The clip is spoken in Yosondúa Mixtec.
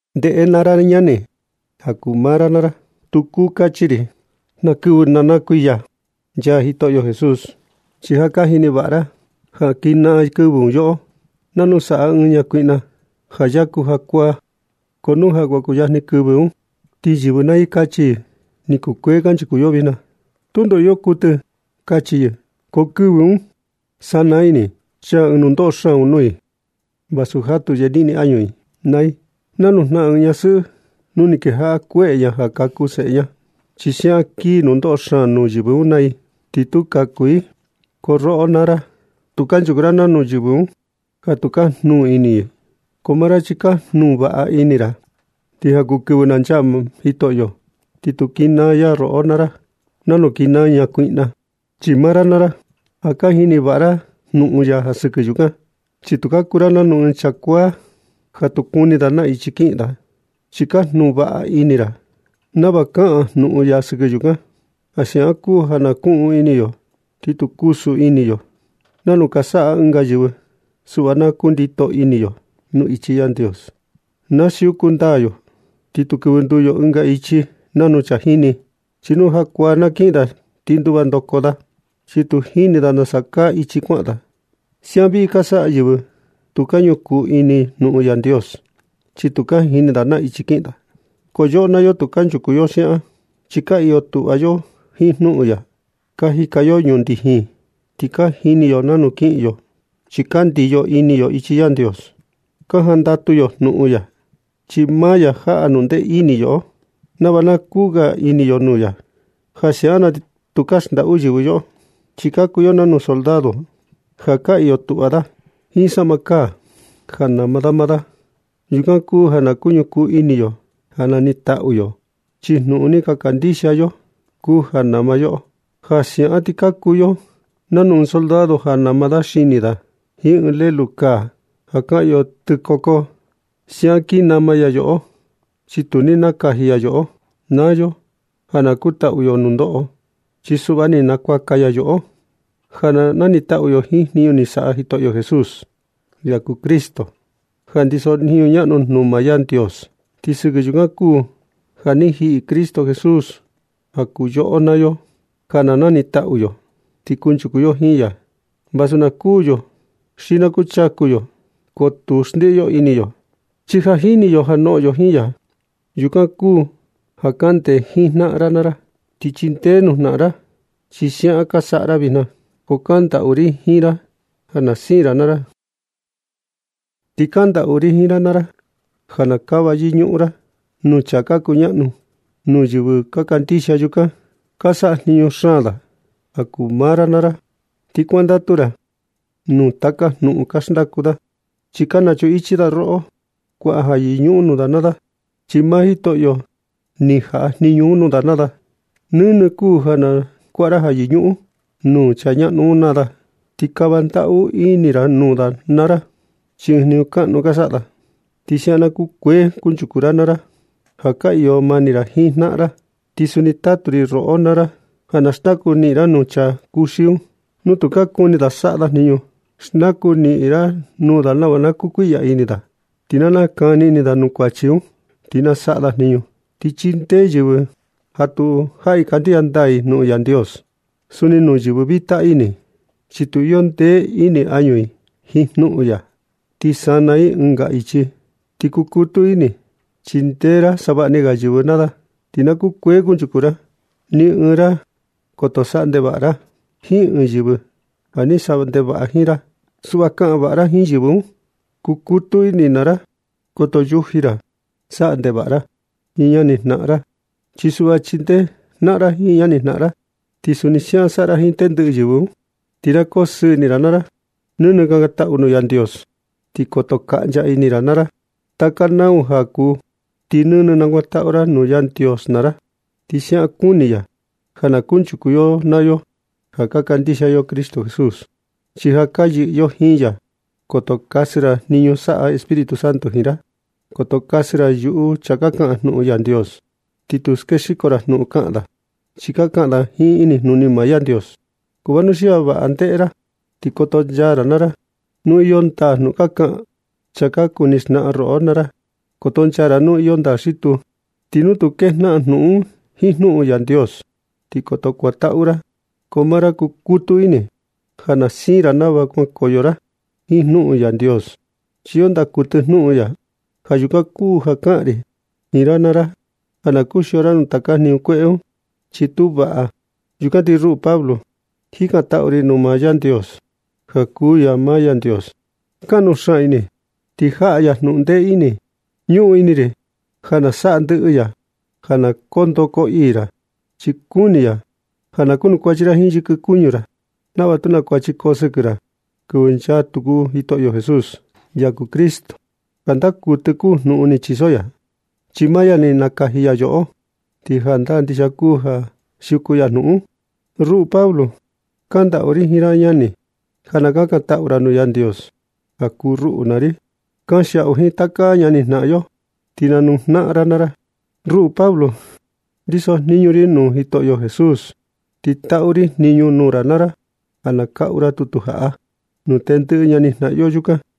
Ndeꞌe naa ra ñani, ja kuu maa ra naa ra tu kuu kachi ri na kɨvɨ ni na kuiya nchaa Jitoꞌo Jesús. Chi ja ka jini vaꞌa ra ja kinaa kɨvɨ un yoꞌo nanu saꞌa ɨɨn ñakuiꞌna ja yaku jakuaa. Ko nu kuan kuyajni kɨvɨ un ti yɨvɨ naa i kachi i: “Ni kukuee kanchuku yo vijna, tundo iyo kuɨtɨ”, kachi i. Ko kɨvɨ un, chi sanaa ini i, ti chaa ɨɨn nundoꞌo xaan un nuu i. Vasu jatu yeniꞌni añu i naa i nanu jnaꞌan ɨɨn ñasɨꞌɨ nu ni kejaꞌa kueꞌe ña ja kaku seꞌe ña. Chi siaꞌan kii nundoꞌo xaan nuu yɨvɨ un naa i, tu tu kaku i. Ko roꞌo naa ra, tu kanchuku ra nanu yɨvɨ un ja tu ka jnuu ini i. Ko maa ra chi ja ka jnuu vaꞌa ini ra, ti ja kuu kɨvɨ na nchaa Jitoꞌo, ti tu kinaa ya roꞌo naa ra nanu kinaa ɨɨn ñakuiꞌna. Chi maa ra naa ra, ja ka jini vaꞌa ra jnuꞌun ya sɨkɨ yukan. Chi tu ka kuu ra nanu ɨɨn chaa kuaa ja tu kuni da na ichi kiꞌin da, chi ka jnuu vaꞌa ini ra nava kaꞌan jnuꞌun ya sɨkɨ yukan. Ja siaꞌan kuu ja na kuꞌun ini yo, ti tu kusu ini yo nanu ka saꞌa ɨnga yɨvɨ. Suꞌva na kundito ini yo nuu ichi Yandios. Na siuku ndaa yo ti tu kɨvɨ nduu yo ɨnga ichi nanu chaa jíni. Chi nu jakuaa na kiꞌin da ti nduva ndoko da, chi tu jini da nasa kaa ichi kuaꞌan da. Siaꞌan vii ka saꞌa yɨvɨ tu ka ñukuu ini jnuꞌun Yandios, chi tu ka jini da na ichi kiꞌin da. Ko yoꞌo naa yo tu kunchuku yo siaꞌan, chi ka iyo tuꞌva yo jiin jnuꞌun ya. Ka jika yo ñundijin, ti ka jini yo nanu kiꞌin yo, chi ka ndiyo ini yo ichi Yandios. Ka jandatu yo jnuꞌun ya, chi maa ya jaꞌa jnundee ini yoꞌo nava na kuu ga ini yo nuu ya. Ja siaꞌan na ti tukaa ga xndaꞌu yɨvɨ yoꞌo, chi ka kuu yo nanu soldado ja ka iyo tuꞌva da jiin saꞌma kaa ja nama maa da. Yukan kuu ja ka ñukuu ini yo ja nanitaꞌu yo, chi jnuꞌun ni ka kandixia yo un kuu ja nama yoꞌo. Ja siaꞌan ti ka kuu yo nanu ɨɨn soldado ja nama da xini da jiin ɨɨn lelu kaa (ja kaꞌan yo tɨkoko). Siaꞌan kin nama ya yoꞌo, chi tu ni nakaji ya yoꞌo naa yo ja na kutaꞌu yo nundoꞌo. Chi suꞌva ni nakuaka ya yoꞌo ja na nanitaꞌu yo jiin jniñu ni saꞌa Jitoꞌo Jesús, ya kuu Cristo ja ndiso jniñu ñaꞌnu un nuu maa Yandios. Ti sɨkɨ yukan kuu ja ni jiꞌi Cristo Jesús ja kuu yoꞌo naa yo ja na nanitaꞌu yo, ti kunchuku yo jiin ya. Vasu na kuū yo xi na kuchaku yo, ko tu xndiꞌi yo ini yo, chi ja jini yo ja noꞌon yo jiin ya. Yukan kuu ja kaꞌan ndee jiin jnaꞌan ra naa ra, ti chindee nuu jnaꞌan ra. Chi siaꞌan ka saꞌa ra vijna, ko kandaꞌu ri jiin ra ja na siin ra naa ra. Ti kandaꞌu ri jiin ra naa ra ja na kava yɨñuꞌun ra nuu chaa ka kuñaꞌnu nuu yɨvɨ ka kandixia yukan, chi ka sajniñu xaan da ja kuu maa ra naa ra. Ti kuandatu ra nuu taka jnuꞌun ka xndaku da, chi ka nachuꞌun ichi da roꞌo naa ra. Kuaꞌa ja yɨñuꞌun nuu da naa da, chi maa Jitoꞌo ni jaꞌa jniñu nuu da naa da. Nɨnɨ kuu ja na nakuaꞌa ra ja yɨñuꞌun nuu chaa ñaꞌnu un naa da, ti kava ndaꞌu ini ra nuu da naa ra, chi ɨɨn jniñu kaꞌnu ka saꞌa da. Ti siaꞌan na kukuee kunchuku ra naa ra ja ka iyo mani ra jiin jnaꞌan ra. Ti suni tatu ri roꞌo naa ra ja na xndaku niꞌin ra nuu chaa kuxi un nu tu ka kuni saꞌa da jniñu. Xndaku niꞌin ra nuu da nava na kukuiꞌya ini da, ti na nakani ini da nuu kuachi un, ti na saꞌa da jniñu. Ti chindee yɨvɨ ja tu jaꞌi kandixia ndaa i jnuꞌun Yandios. Suni nuu yɨvɨ vita ini, chi tu iyo ndee ini añu i jiin jnuꞌun ya ti sana i ɨnga ichi. Ti kukutu ini chindee ra savaꞌni ga yɨvɨ naa ra, ti na kukuee kunchuku ra. Ni ɨɨn ra, koto saꞌa ndevaꞌa ra jiin ɨɨn yɨvɨ ja ni saꞌa ndevaꞌa jiin maa ra. Suꞌva kaꞌan vaꞌa ra jiin yɨvɨ un. Kukutu ini naa ra, koto yuji ra saꞌa ndevaꞌa ra jiin ñani jnaꞌan ra. Chi suꞌva chindee jnaꞌan jiin ñani jnaꞌan ra. Ti suni siaꞌan saꞌa ra jiin tendɨꞌɨ yɨvɨ un. Ti ja na koo sɨɨ ini ra naa ra. Nɨnɨ kakantaꞌu nuu Yandios ti koto kaꞌncha ini ra naa ra. Taka nau ja kuu, ti nɨnɨ nakuantaꞌu ra nuu Yandios naa ra, chi siaꞌan kuni ya ja na kunchuku yoꞌo naa yo ja ka kandixia yo Cristo Jesús, chi ja ka yɨꞌɨ yo jiin ya. Koto kasɨ ra jniñu saꞌa Espíritu Santo jiin ra. Koto kasɨ ra yuꞌu chaa ka kaꞌan jnuꞌun Yandios, ni tu skexiko ra jnuꞌun ka kaꞌan da, chi ka kaꞌan da jiin inijnuni maa Yandios. Ko vanuxia vaꞌa ndeꞌe ra ti kotonchaa ra naa ra nu iyo ndaa jnuꞌun ka kaꞌan chaa ka kuni xnaꞌan roꞌo naa ra. Kotonchaa ra nu iyo ndaa xi tuu. Ti nu tu kejnaꞌan jnuꞌun un jiin jnuꞌun Yandios, ti koto kuantaꞌu ra. Ko maa ra kukutu ini ja na siin ra nava kuankoyo ra jiin jnuꞌun Yandios, chi iyo ndaa kuɨtɨ jnuꞌun ya. Ja yukan kuu ja kaꞌan ri jiin ra naa ra ja na kuxio ra nuu taka jniñu kueꞌe un, chi tu vaꞌa. Yukan ti ruꞌu Pablo, jikantaꞌu ri nuu maa Yandios, ja kuu ya maa Yandios kaꞌnu xaan ini, ti jaꞌa ya jnundee ini. Ñuꞌun ini ri ja na saꞌa ndɨꞌɨ ya ja na koo ndoo koo ii ra, chi kuni ya ja na kunukuachi ra jiin yɨkɨ kuñu ra, nava tu naa kuachi koo sɨkɨ ra kɨvɨ nchaa tuku Jitoꞌo Jesús, ya kuu Cristo. Ti jandaa kuɨtɨ kuu jnuꞌun ni chiso ya, chi maa ya ni nakaji ya yoꞌo, ti jandaa ndixia kuu ja siuku ya jnuꞌun un. Ruꞌu Pablo, kandaꞌu ri jiin ra naa ra ñani, ja na kakantaꞌu ra nuu Yandios ja kuu ruꞌu naa ri. Kanxiaꞌu jiin taka ñani jnaꞌan yo, ti nanuu jnaꞌan naa ra. Ruꞌu Pablo, ndiso jniñu ri nuu Jitoꞌo Jesús. Ti taꞌu ri jniñu nuu ra naa ra ja na kaꞌu ra tutu jaꞌa nuu tendɨꞌɨ ñani jnaꞌan yo yukan.